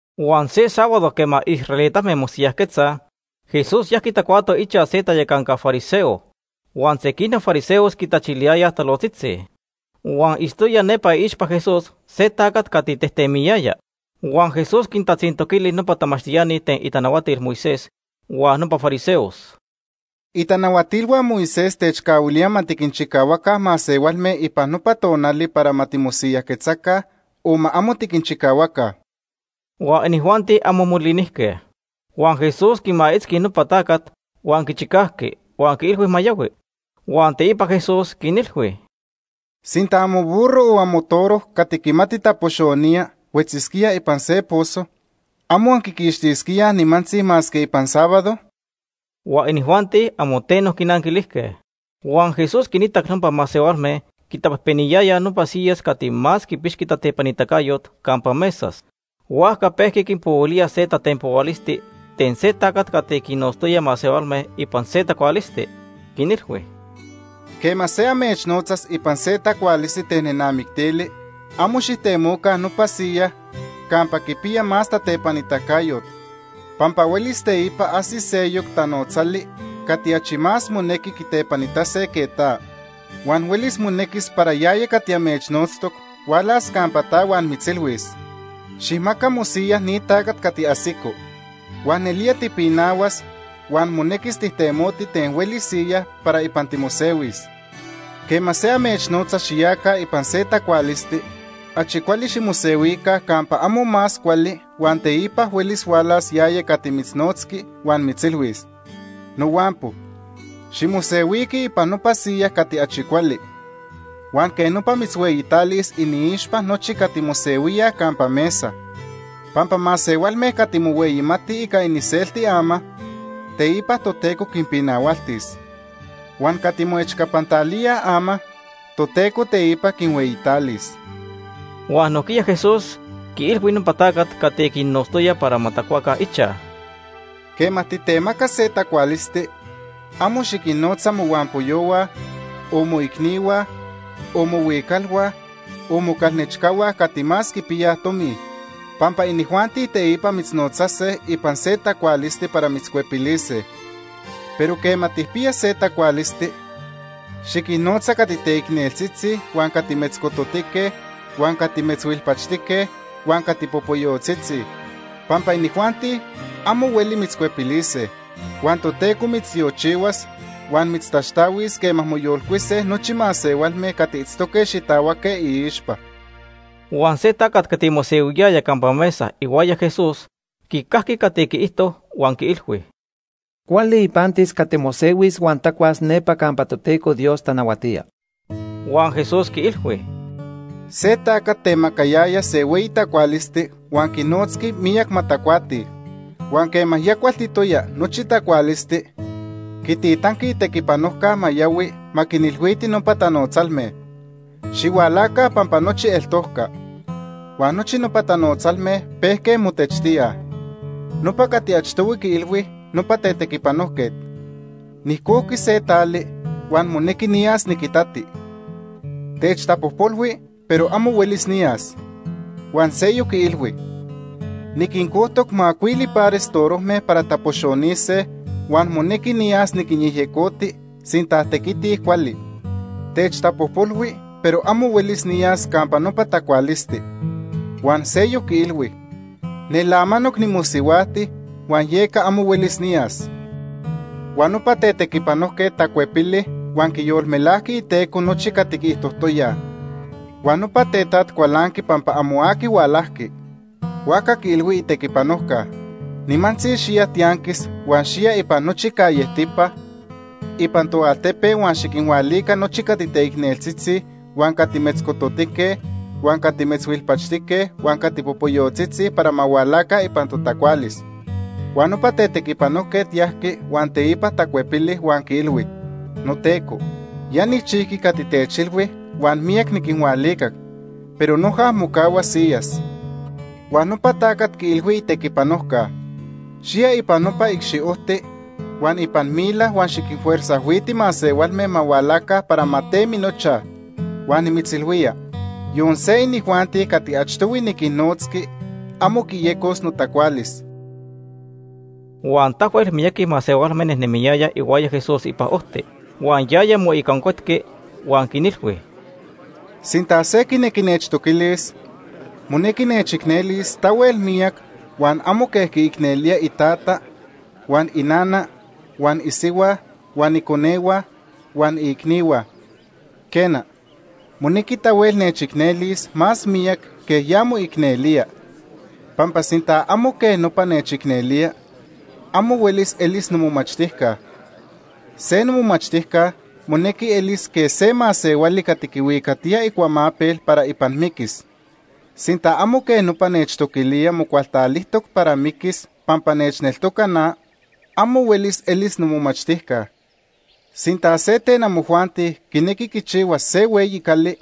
Huan se sábado quema israelitame mosiyajquetzaj, Jesús yajqui tacuato ichaj se tayacanca fariseo, huan sequinoc fariseos quitachiliyayaj talojtzitzi. Huan itztoya nepa iixpa Jesús se tacat cati tejtemiyaya. Huan Jesús quintatzintoquili nopa tamachtiani ten itanahuatil Moisés huan nopa fariseos: ―¿Itanahuatilhua Moisés techcahuilíaj ma tiquinchicahuaca masehualme ipan nopa tonali para ma timosiyajquetzaca o ma amo tiquinchicahuaca? Huan inijuanti amo molinijque. Huan Jesús quimaitzqui nopa tacat huan quichicajqui, huan quiilhui ma yahui. Huan teipa Jesús quinilhui: ―Sinta amoburro o amotoro cati quimati tapoxonía huetzisquía ipan se pozo, ¿amo anquiquixtisquíaj nimantzi masque ipan sábado? Huan inijuanti amo teno quinanquilijque. Huan Jesús quiitac nopa masehualme quitapejpeniyayaj nopa siyas cati más quipixqui tatepanitacayot campa mesas, huajca pejqui quinpohuilía se tatenpohualisti ten se tacat cati quinnotztoya masehualme ipan se tacualisti. Quinilhui: ―Quema se amechnotzas ipan se tacualisti ten nenamictili, amo xijtemoca nopa siyaj campa quipiya más tatepanitacayot pampa huelis teipa ajsis seyoc tanotzali cati achi más monequi quitepanitase que ta. Huan huelis monequis para yaya cati amechnotztoc hualas campa ta huan mitzilhuis: ‘Xijmaca mosiyaj ni tacat cati ajsico.’ Huan nelía tipinahuas huan monequis tijtemoti ten hueli siyaj para ipan timosehuis. Quema se amechnotza xiyaca ipan se tacualisti, achi cuali ximosehuica campa amo más cuali huan teipa huelis hualas yaya cati mitznotzqui huan mitzilhuis: ‘Nohuampo, ximosehuiqui ipan nopa siya cati achi cuali.’ Huan quej nopa mitzhueyitalis iniixpa nochi cati mosehuíaj campa mesa. Pampa masehualme cati mohueyimatij ica iniselti ama, teipa Toteco quinpinahualtis. Huan cati moechcapantalíaj ama, Toteco teipa quinhueyitalis. Huan nojquiya Jesús quiilhui nopa tacat cati quinnotztoya para ma tacuaca ichaj: ―Quema titemaca se tacualisti, amo xiquinnotza mohuampoyohua, o moicnihua, o mohuicalhua, o mocalnechcahua cati más quipiyaj tomi, pampa inijuanti teipa mitznotzase ipan se tacualisti para mitzcuepilise. Pero quema tijpiya se tacualisti, xiquinnotza cati teicneltzitzi huan cati metzcototique huan cati metzhuilpachtique huan cati popoyotzitzi, pampa inijuanti amo hueli mitzcuepilise. Huan Toteco mitztiochihuas huan mitztaxtahuis quema moyolcuise nochi masehualme cati itztoque xitahuaque iixpa. Huan se tacat cati mosehuiyaya campa mesa ihuaya Jesús quicajqui cati quiijto huan quiilhui: ―Cuali ipantis cati mosehuis huan tacuas nepa campa Toteco Dios tanahuatía. Huan Jesús quiilhui: ―Se tacat temacayaya se hueyi tacualisti huan quinnotzqui miyac ma tacuatij. Huan quema ya cualtitoya nochi tacualisti, quititanqui itequipanojca ma yahui ma quinilhuiti nopa tanotzalme: ‘Xihualaca pampa nochi eltojca.’ Huan nochi nopa tanotzalme pejque motechtíaj. Nopa cati achtohui quiilhui nopa tetequipanojquet: ‘Nijcojqui se tali, huan monequi niyas niquitati. Techtapojpolhui, pero amo huelis niyas.’ Huan seyoc quiilhui: ‘Niquincojtoc macuili pares torojme para tapoxonise, huan monequi niyas niquinyejyecoti sinta tequitij cuali. Techtapojpolhui, pero amo huelis niyas campa nopa tacualisti.’ Huan seyoc quiilhui: ‘Nel amanoc nimosihuajti huan yeca amo huelis niyas.’ “Huan nopa tetequipanojquet tacuepili huan quiyolmelajqui iteco nochi cati quiijtojtoyaj. Huan nopa tetaj cualanqui pampa amo aqui hualajqui. Huajca quiilhui itequipanojca: ‘Nimantzi xiya tianquis huan xiya ipan nochi callejtipa ipan toaltepe, huan xiquinhualica nochi cati teicneltzitzi, huan cati metzcototique, huan cati metzhuilpachtique huan cati popoyotzitzi para ma hualaca ipan totacualis.’ Huan nopa tetequipanojquet yajqui huan teipa tacuepili, huan quiilhui: ‘Noteco, ya nijchijqui cati techilhui huan miyac niquinhualicac, pero noja mocahua siyas.’ Huan nopa tacat quiilhui itequipanojca: ‘Xiya ipan nopa icxiojti huan ipan mila huan xiquinfuerzajhuiti masehualme ma hualaca para ma temi nochaj. Huan nimitzilhuía, yon se inijuanti cati achtohui niquinnotzqui amo quiyecos notacualis.’” Huan tahuel miyaqui masehualme nejnemiyayaj ihuaya Jesús ipan ojti, huan yaya moicancuetqui huan quinilhui: “Sinta se quinequi nechtoquilis, monequi nechicnelis tahuel miyac huan amo quej quiicnelía itata, huan inana, huan isihua, huan iconehua, huan iicnihua. Quena, monequi tahuel nechicnelis más miyac quej ya moicnelía, pampa sinta amo quej nopa nechicnelía, amo huelis elis nomomachtijca. Se nomomachtijca monequi elis quej se masehuali cati quihuicatiya icuamapel para ipan miquis. Sinta amo quej nopa nechtoquilía mocualtalijtoc para miquis pampa nechneltoca na, amo huelis elis nomomachtijca. “Sinta se ten amojuanti quinequi quichihuas se hueyi cali,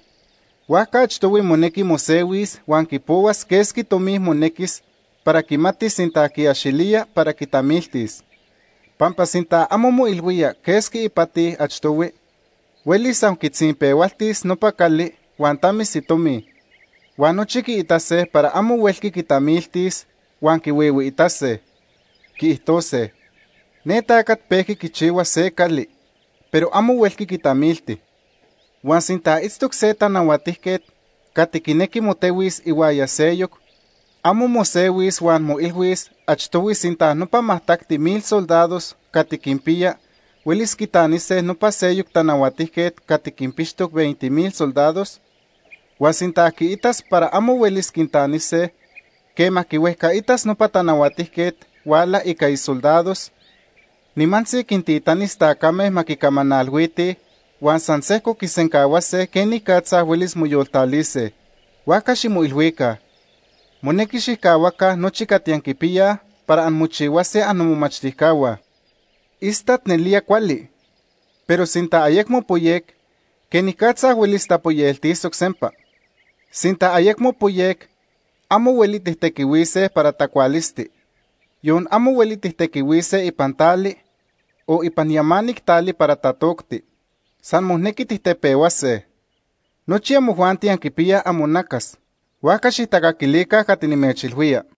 huajca achtohui monequi mosehuis huan quipohuas quesqui tomi monequis para quimatis sinta quiaxilía para quitamiltis. Pampa sinta amo moilhuía quesqui ipati achtohui, huelis san quitzinpehualtis nopa cali huan tamis itomi. Huan nochi quiitase para amo huelqui quitamiltis, huan quihuihuiitase. Quiijtose: ‘Ne tacat pejqui quichihua se cali, pero amo huelqui quitamilti.’ “Huan sinta itztoc se tanahuatijquet cati quinequi motehuis ihuaya seyoc, ¿amo mosehuis huan moilhuis achtohui sinta nopa majtacti mil soldados cati quinpiya huelis quitanise nopa seyoc tanahuatijquet cati quinpixtoc veinte mil soldados? Huan sinta quiitas para amo huelis quintanise, quema quihuejcaitas nopa tanahuatijquet huala ica isoldados, nimantzi quintitanis tacame ma quicamanalhuitij, huan san sejco quisencahuase quenicatza huelis moyoltalise. Huajca ximoilhuica, monequi xijcahuaca nochi cati anquipiyaj para anmochihuase annomomachtijcahua. “Istat nelía cuali, pero sinta ayecmo poyec, ¿quenicatza huelis tapoyeltisoc sempa? Sinta ayecmo poyec amo hueli tijtequihuise para tacualisti. Yon amo hueli tijtequihuise ipan tali, o ipan yamanic tali para tatocti. San monequi tijtepehuase. Nochi amojuanti anquipiyaj amonacas, huajca xijtacaquilica cati nimechilhuía.”